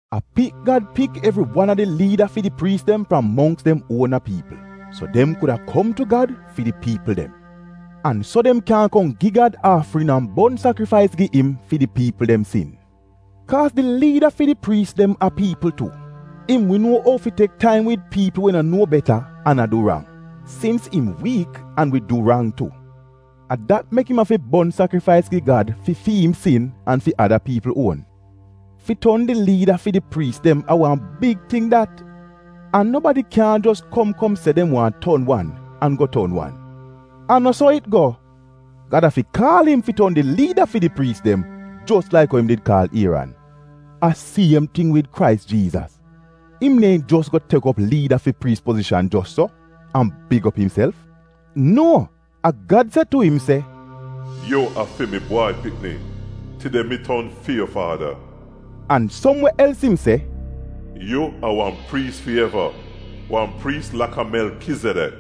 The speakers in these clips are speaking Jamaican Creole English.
A pik Gad pik evri wan a di liida fi di priis dem fram mongks dem uona piipl, so dem kuda kom tu Gad fi di piipl dem. An so dem kyan kom gi Gad aafrin an bon sakrifais gi im fi di piipl dem sin. Kaaz di liida fi di priis dem a piipl tu, an so dem wi nuo ou fi tek taim wid piipl we no nuo beta an a du rang, sins im wiik an wi du rang tu. A dat mek im afi bon sakrifais gi Gad fi fi im sin an fi ada piipl uon. Fi ton di liida fi di priis dem a wan big ting dat an nobadi kyaahn jos kom kom se dem waahn ton wan, an go ton wan. A no so it go. Gad afi kaal im fi ton di liida fi di priis dem, jos laik ou im did kaal Ieran. A siem ting wid Krais Jiizas. Im neehn jos go tek op liida fi priis pozishan jos so, an big op imself — eh-ehn, a Gad se tu im se, “Yu a fi mi Bwai Pikni; tide mi ton fi yu faada!” An som we els im se, “Yu a wan priis fi eva, wan priis laka Melkizedek.”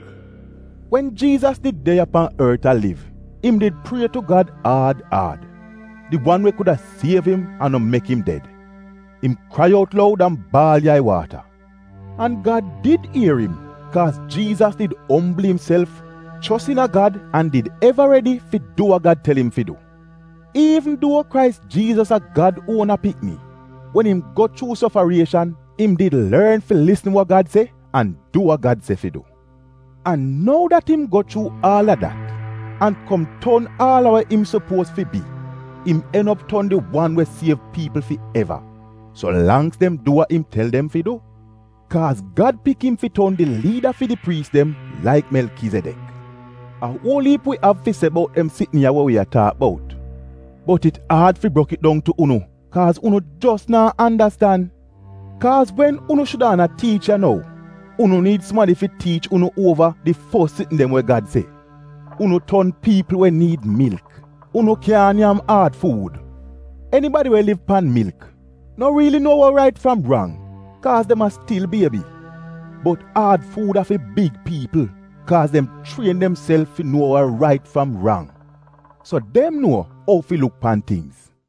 Wen Jiizas did de ya pan ort a liv, im did prie tu Gad aad aad, di wan we kuda siev im an no mek im ded. Im krai out loud an baal yai-waata. An Gad did ier im, kaaz Jiizas did ombl imself, chos iina Gad an did eva redi fi du wa Gad tel im fi du. Iivn duo Krais Jiizas a Gad uona pikni, wen im go chuu sofarieshan im did lorn fi lisn wa Gad se an du wa Gad se fi du. An nou dat im go chuu aal a dat, an kom ton aal a we im sopuoz fi bi, im en op ton di wan we siev piipl fi eva so langks dem du wa im tel dem fi du. Kaaz Gad pik im fi ton di liida fi di priis dem laik Melkizedek. A uol iip wi afi se bout dem sitn ya we wi a taak bout. Bot it aad fi brok it dong tu unu kaaz unu jos naa andastan. Kaaz wen unu shudaana tiich ya nou, unu niid sumadi fi tiich unu uova di fos sitn dem we Gad se. Unu ton piipl we niid milk, unu kyaahn nyam aad fuud! Enibadi we liv pan milk, no riili nuo wa rait fram rang, kaaz dem a stil biebi. Bot aad fuud a fi big piipl kaaz dem chrien demself fi nuo wa rait fram rang, so dem nuo ou fi luk pan tingz.